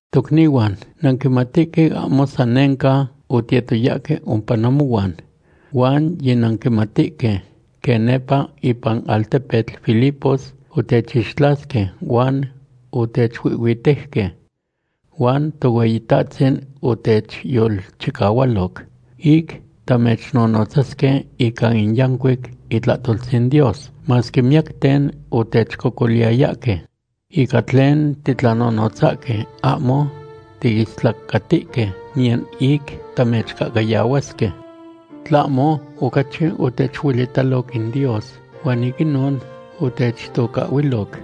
Tocnihuan, nanquimatihque ahmo san nenca otiyetoyahque ompa namohuan. Huan yinanquimatihque quen nepa ipan altepetl Filipos otechixtlasque huan otechuihhuitejque. Huan Tohueyitahtzin otechyolchicahualoc ic tamechnonotzasque ica in yancuic itlahtoltzin Dios, masque miyacten otechcocoliyayahque. Ica tlen titlanonotzahque, ahmo tiistlacatihque niyan ic tamechcahcayahuasque. Tlahmo ocachi otechuelitaloc in Dios, huan ic inon otechtocahhuiloc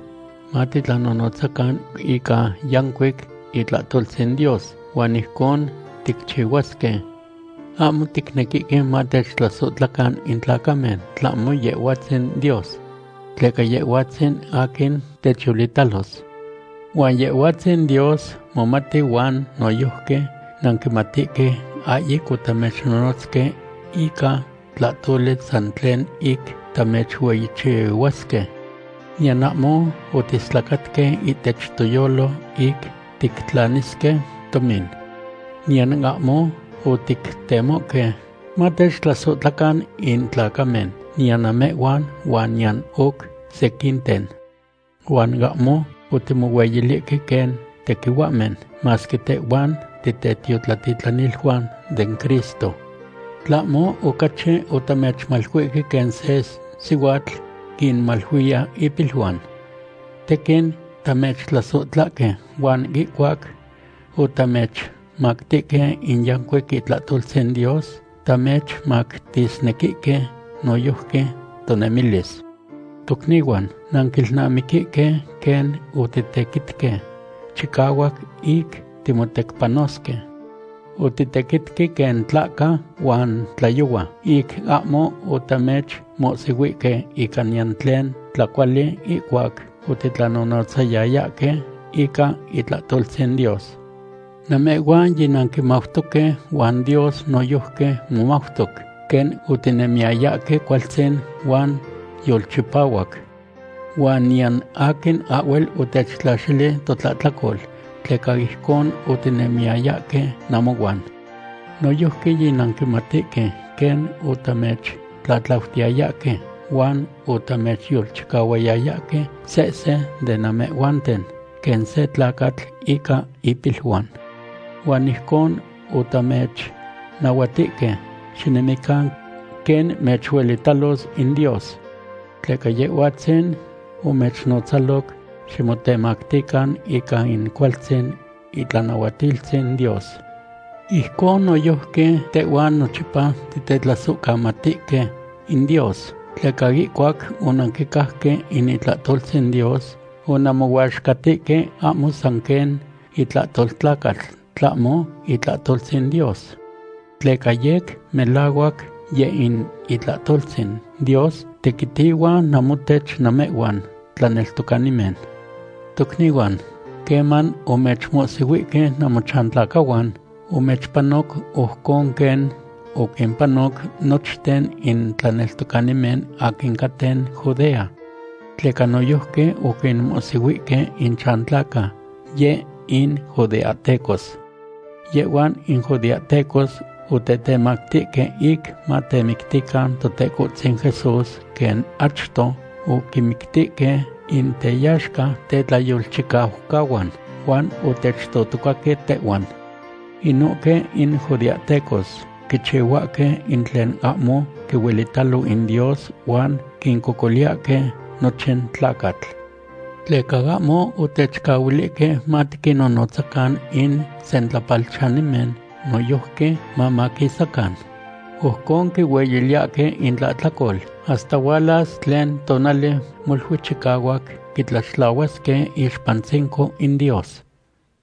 matitlanonotzacan ica yancuic itlahtoltzin Dios, huan ijcon ticchihuasque. Ahmo ticnequihque matechtlasohtlacan in tlacamen, tlahmo Yehhuatzin Dios. Tleca Yehhuatzin aquin techyolitalos. Huan Yehhuatzin Dios momati huan noyojqui nanquimatihque ahyic otamechnonotzque ica tlahtoli san tlen ic tamechueyichihuasque. Niyan ahmo otiistlacatque ihtech toyolo ic tictlanisque tomin. Niyan ahmo otictemohque matechtlasohtlacan in tlacamen, niyan namehhuan huan niyan oc sequinten. Huan ahmo otimohueyilihque quen tequihuahmen, masque tehhuan titetiotlatitlaniluan den Cristo. Tlahmo ocachi otamechmaluihque quen se sihuatl quinmaluiya ipiluan. Tequin tamechtlasohtlahque huan ihcuac otamechmactihque in yancuic itlahtoltzin Dios, tamechmactisnequihque noyojqui tonemilis. Tocnihuan, nanquilnamiquihque quen otitequitque chicahuac ic timotecpanosque. Otitequitque quen tlahca huan tlayohua ic ahmo otamechmohsihuihque ica niyan tlen tlacuali ihcuac otitlanonotzayayahque ica itlahtoltzin Dios. Namehhuan yinanquimautoque huan Dios noyojqui momautoc quen otinemiyayahque cualtzin huan yolchipahuac. Huan niyan aquin ahhuel otechtlaxili totlahtlacol, tleca ijcon otinemiyayahque namohuan. Noyojqui yinanquimatihque quen otamechtlatlautiyayahque huan otamechyolchicahuayayahque sehse de namehhuanten quen se tlacatl ica ipiluan. Huan ijcon otamechnahuatihque xinemican quen mechuelitalos in Dios. Tleca Yehhuatzin omechnotzaloc ximotemactican ica in cualtzin itlanahuatiltzin Dios. Ijcon noyojqui tehhuan nochipa titetlasohcamatihque in Dios, tleca ihcuac onanquicajque in itlahtoltzin Dios onanmohuaxcatihque ahmo san quen itlahtol tlacatl, tlahmo itlahtoltzin Dios. Tleca yec melahuac yeh in itlahtoltzin Dios tequitihua namotech namehhuan tlaneltocanimen. Tocnihuan, queman omechmohsihuihque namochantlacahuan, omechpanoc ojcon quen oquimpanoc nochten in tlaneltocanimen aquin caten Judea. Tleca noyojqui oquinmohsihuihque inchantlaca yeh in judeahtecos. Yehhuan in judeahtecos otetemactihque ic matemictican Totecohtzin Jesús quen achto oquinmictihque in teyaxca tetlayolchicaucahuan, huan otechtotocaque tehhuan. Inohque in judeahtecos quichihuahque in tlen ahmo quihuelitalo in Dios huan quincocoliyahque nochin tlacatl. Tleca ahmo otechcahuilihque matiquinnonotzacan in sentlapalchanimen noyojqui mamaquisacan. Ojcon quihueyiliyahque intlahtlacol hasta hualas tlen tonali molui chicahuac quitlaxtlahuasque iixpantzinco in Dios.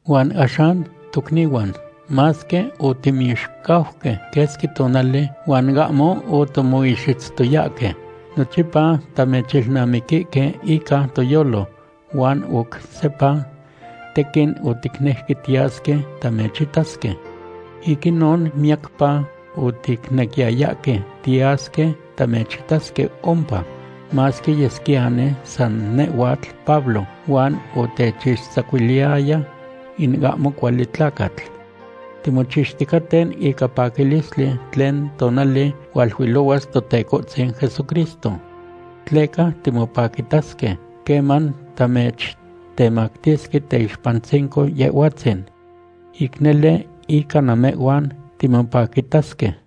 Huan axan, tochnihuan, masque otimixcauque quesqui tonali huan ahmo otimoixitztoyahque, nochipa tamechilnamiquihque ica toyolo. Huan oc sepa tequin oticnejque tiyasque tamechitasque. Ic inon miyacpa oticnequiyayahque tiyasque tamechitasque ompa, masque yesquiyani san nehhuatl Pablo, huan otechtzacuiliyaya in ahmo cuali tlacatl. Timochixticaten ica paquilistli tlen tonali hualuilohuas Totecohtzin Jesucristo. Tleca timopaquitasque queman tamechtemactisque teyixpantzinco Yehhuatzin. Ic nele ica namehhuan timopaquitasque.